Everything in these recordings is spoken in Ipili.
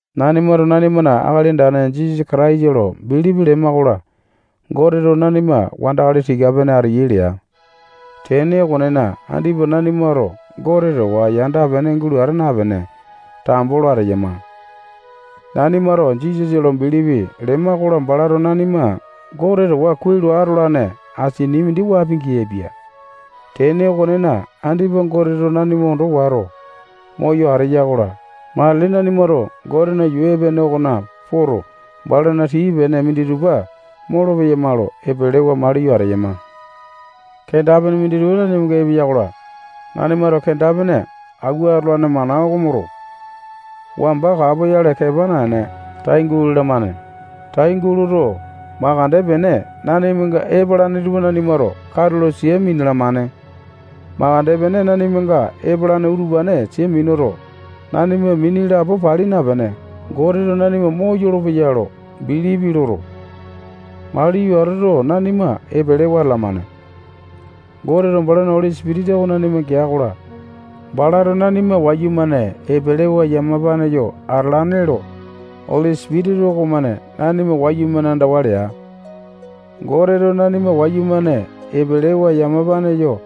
Nanimato nanimana Akali Andane Jisasa Kataisa lo bilipi lema-kola, Goteto nanima wandakali tika-pene ateyai lea. Tene okonena, andipa nanimato Gote towa yanda-pene gulo ata napene, tambo lo ateyama. Nanimato Jisasa lo bilipi lema-kola, balato nanima Gote towa kuai lo atolane asini mindi wapi-geaipia. Tene okonena, andipa Goteto nanima ondo wato, moyo ateya-kola, matili nanimato Gotena yuu epene okona poto, balana tii-pene minditupa molopeyama lo epelewa maliyo ateyama. Kenda-pene minditupa nanimanga epeya-kola, nanimato kenda-pene auwa atolane mana oko moto, wamba kapoyale kepa naene, tai gulalamane. Tai guloto, makande pene nanimanga epalane tupa nanimato katulo sia minalamane. Makande pene nanimanga epalane utupane sia minuto, nanima mini lapo pali napene, Goteto nanima moyolo-peya lo bilipi loto, maliyo atoto, nanima epelewa atalamane. Goteto balana Oli Sipitisa oko nanima gea-kola, balato nanima wayumane epelewa yamapane yo atalane lo Oli Sipitisa okomane nanima wayumane andawa lea. Goteto nanima wayumane epelewa yamapane yo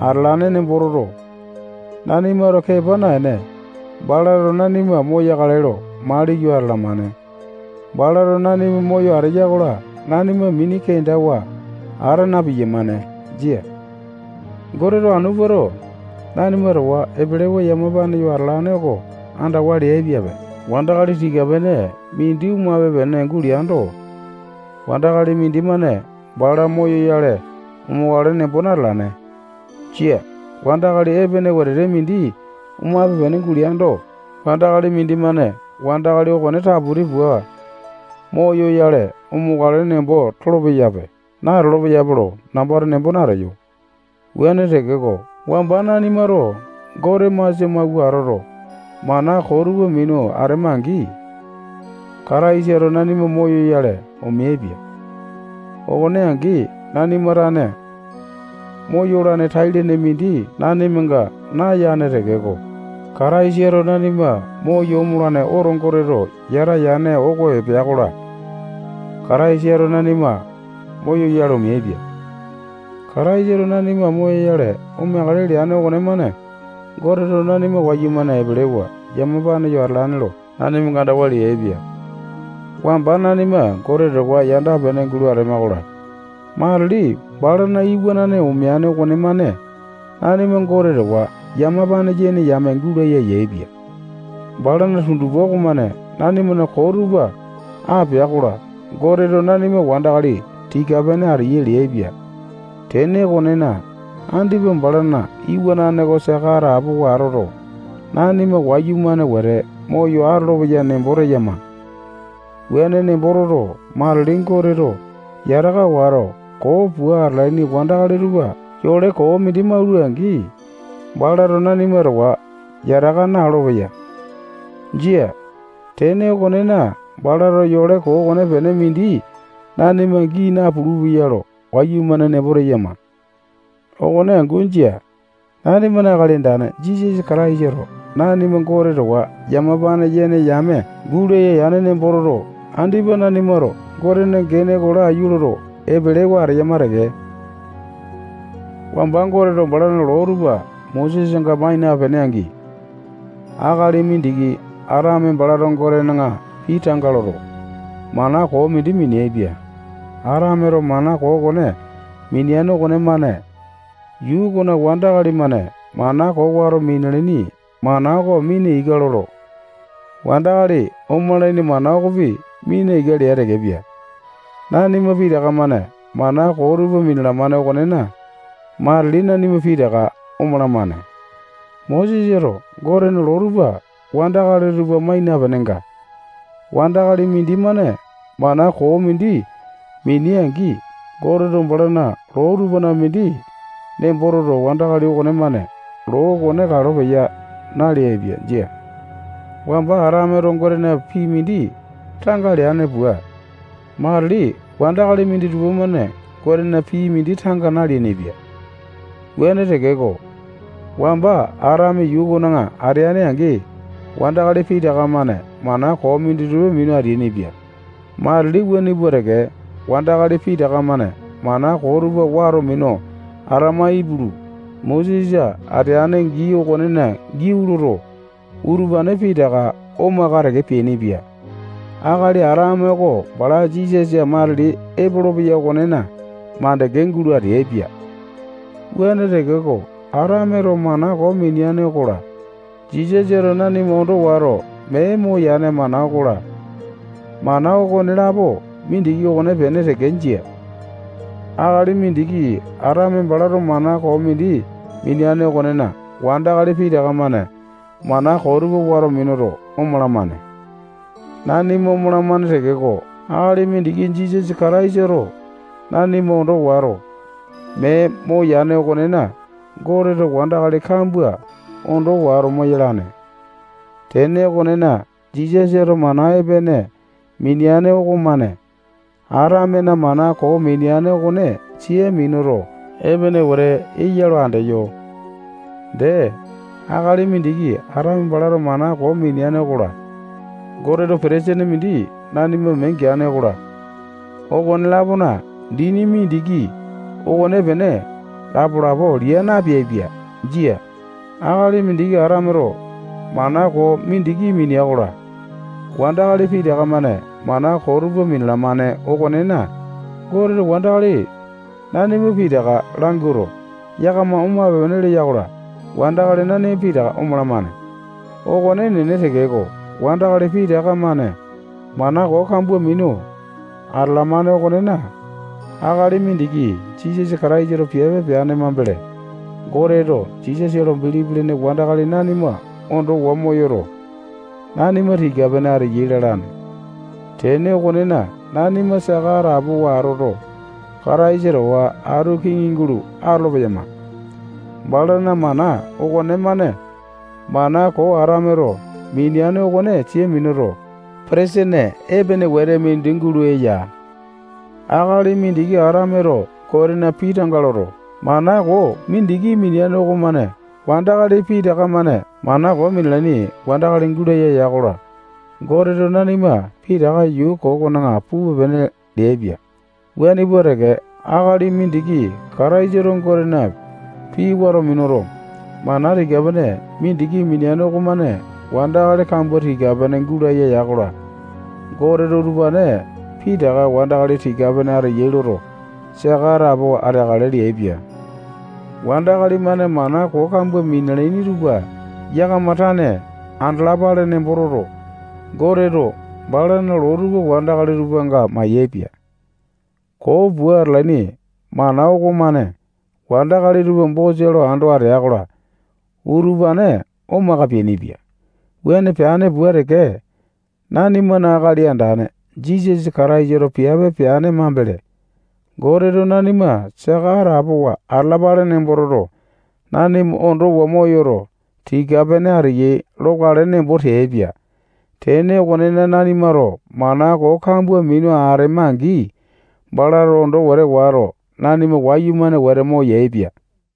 atalane nembo toto, nanimato kepa naene, balato nanima moyakale lo maliyo atalamane. Balato nanima moyo ateya-kola, nanima mini kendawa ata na-piyamane. Jia. Goteto anu puato, nanima towa epelewa yamapane yo atalane oko andawa leaipiape. Wandakali tika-pene mindi omape-pene guleando, wandakali mindimane bala moyoyale omokale nembo natalane. Jia. Wandakali epene wetete mindi omape-pene guleando, wandakali mindimane wandakali okone taputi pua moyoyale omokale nembo tolo-peyape, natolo-peyape lo nambato nembo nateyo. Wuane tekeko, wamba nanimato Gote masia mauwa atoto, mana koo tupa minu atema-angi, Kataisato nanima moyoyale omeaipia. Okone angi, nanima tane moyolane tai-lene mindi nanimanga nayane tekeko, Kataisato nanima moyo omolane oto Goteto yata yane oko epea-kola, Kataisato nanima moyoyale omeaipia. Kataisato nanima moyoyale omeakale leane okonemane Goteto nanima wayumane epelewa yamapane yo atalane lo nanimanga andawa leaipia. Wamba nanima Gote towa yanda-pene gulo atema-kola, matili balana iwanane omeane okonemane nanima Gote towa yamapane yene yame gulaya yaepia. Balana tundupa okomane nanimana koo tupa apea-kola, Goteto nanima wandakali tika-pene ateyai leaipia. Tene okonena, andipa balana iwanane oko saka atapowa atoto, nanima wayumane wete moyo atolopeya nembo teyama. Wuane nembo toto, matili Goteto yataka wato, koo pua atalaini wandakali tupa yole koo mindi maula-angi, balato nanima towa yataka na-olopeya. Jia. Tene okonena, balato yole koo okonepene mindi nanima gii napulu-peya lo wayumane nembo teyama. Okone angu jia. Nanimana Akali Andane Jisasa Kataisato nanima Gote towa yamapane yene yame gulaya yane nembo toto, andipa nanimato Gotena gene oko laiyu loto, epelewa ateyama teke. Wamba Goteto balana loo tupa Mosesanga mai napene angi, akali mindiki Atame balato Gotena pii tanga loto, mana koo mindi mineaipia. Atameto mana koo okone mineane okonemane yuu okona wandakali-mane mana koo wato minalaini mana oko mina ika loto, wandakali omalaini mana okopi mina ika lea tekepia. Nanima pitaka-mane mana koo tupa minalamane okonena, matili nanima pitaka omalamane. Mosesato Gotena loo tupa wandakali tupa mai napenenga, wandakali mindimane mana koo mindi minea-angi, Goteto balana loo tupana mindi nembo toto, wandakali okonemane loo okone kalo peya naleaipia. Jia. Wamba Atameto Gotena pii mindi tanga leane pua, matili wandakali minditupa-mane Gotena pii mindi tanga naleainipia. Wuane tekeko, wamba Atame yuu okona ateane-angi, wandakali pitaka-mane mana koo minditupa minu ateainipia. Matili wuane pua teke, wandakali pitaka-mane mana koo tupa wato minu atama ipulu, Mosesa ateane gii okonena giau loto, utupane pitaka omaka teke peainipia. Akali Atame oko bala Jisasa matili epolopeya okonena mandeke gulo ateaipia. Wuane tekeko, Atameto mana koo mineane okola, Jisasato nanima ondo wato mee moyane mana okola, mana okonelapo mindiki okonepene teke jia. Akali mindiki Atame balato mana koo mindi mineane okonena, wandakali pitaka-mane mana koo tupa wato minuto, omalamane. Nanima omalamane tekeko, akali mindiki Jisasa Kataisato nanima ondo wato, mee moyane okonena, Goteto wandakali kambua ondo wato moyalane. Tene okonena, Jisasato mana epene mineane okomane Atamena mana koo mineane okone sia minuto, epene wete eya lo andeyo. Dee, akali mindiki Atame balato mana koo mineane okola, Goteto petesene mindi nanima mee geane okola, okone-lapona dini mindiki okonepene lapo-lapo lia napeaipia. Jia. Akali mindiki Atameto mana koo mindiki minea-kola, wandakali pitaka-mane mana koo tupa minalamane okonena, Goteto wandakali nanima pitaka lamawuato, yakama omape-pene lea-kola, wandakali nanima pitaka omalamane. Okone enene tekeko, wandakali pitaka-mane mana koo kambua minu atalamane okonena, akali mindiki Jisasa Kataisato piape peane mambele, Goteto Jisasa lo bilipi lene wandakali nanima ondowa moyoto, nanima tika-pene ateyai lalane. Tene okonena, nanima saka atapowa atoto, Kataisa towa atu kiŋi gulo atolo-peyama. Balana mana okonemane mana koo Atameto mineane okone sia minuto, petesene epene wete mindi gulo eya. Akali mindiki Atameto Gotena pii tanga loto, mana koo mindiki mineane okomane wandakali pitaka-mane mana koo minalaini wandakali gulaya ya-kola, Goteto nanima pitaka yuu koo okona pupe-pene leaipia. Wuane pua teke, akali mindiki Kataisato Gotena pii wato minuto, mana tika-pene mindiki mineane okomane wandakali kambua tika-pene gulaya ya-kola, Goteto utupane pitaka wandakali tika-pene ateyai loto, saka atapowa ateakale leaipia. Wandakali-mane mana koo kambua minalaini tupa yakama tane andalapale nembo toto, Goteto balana loo tupa wandakali tupanga mayaepia. Koo pua atalaini mana okomane wandakali tupa bosa lo ando atea-kola, utupane omaka peainipia. Wuane peane pua teke, nanimana Akali Andane Jisasa Kataisato piape peane mambele, Goteto nanima saka atapowa atalapale nembo toto, nanima ondowa moyoto, tika-pene ateyai lokale nembo teaipia. Tene okonena, nanimato mana koo kambua minu atema-angi, balato ondo wete wato, nanima wayumane wete moyaepia.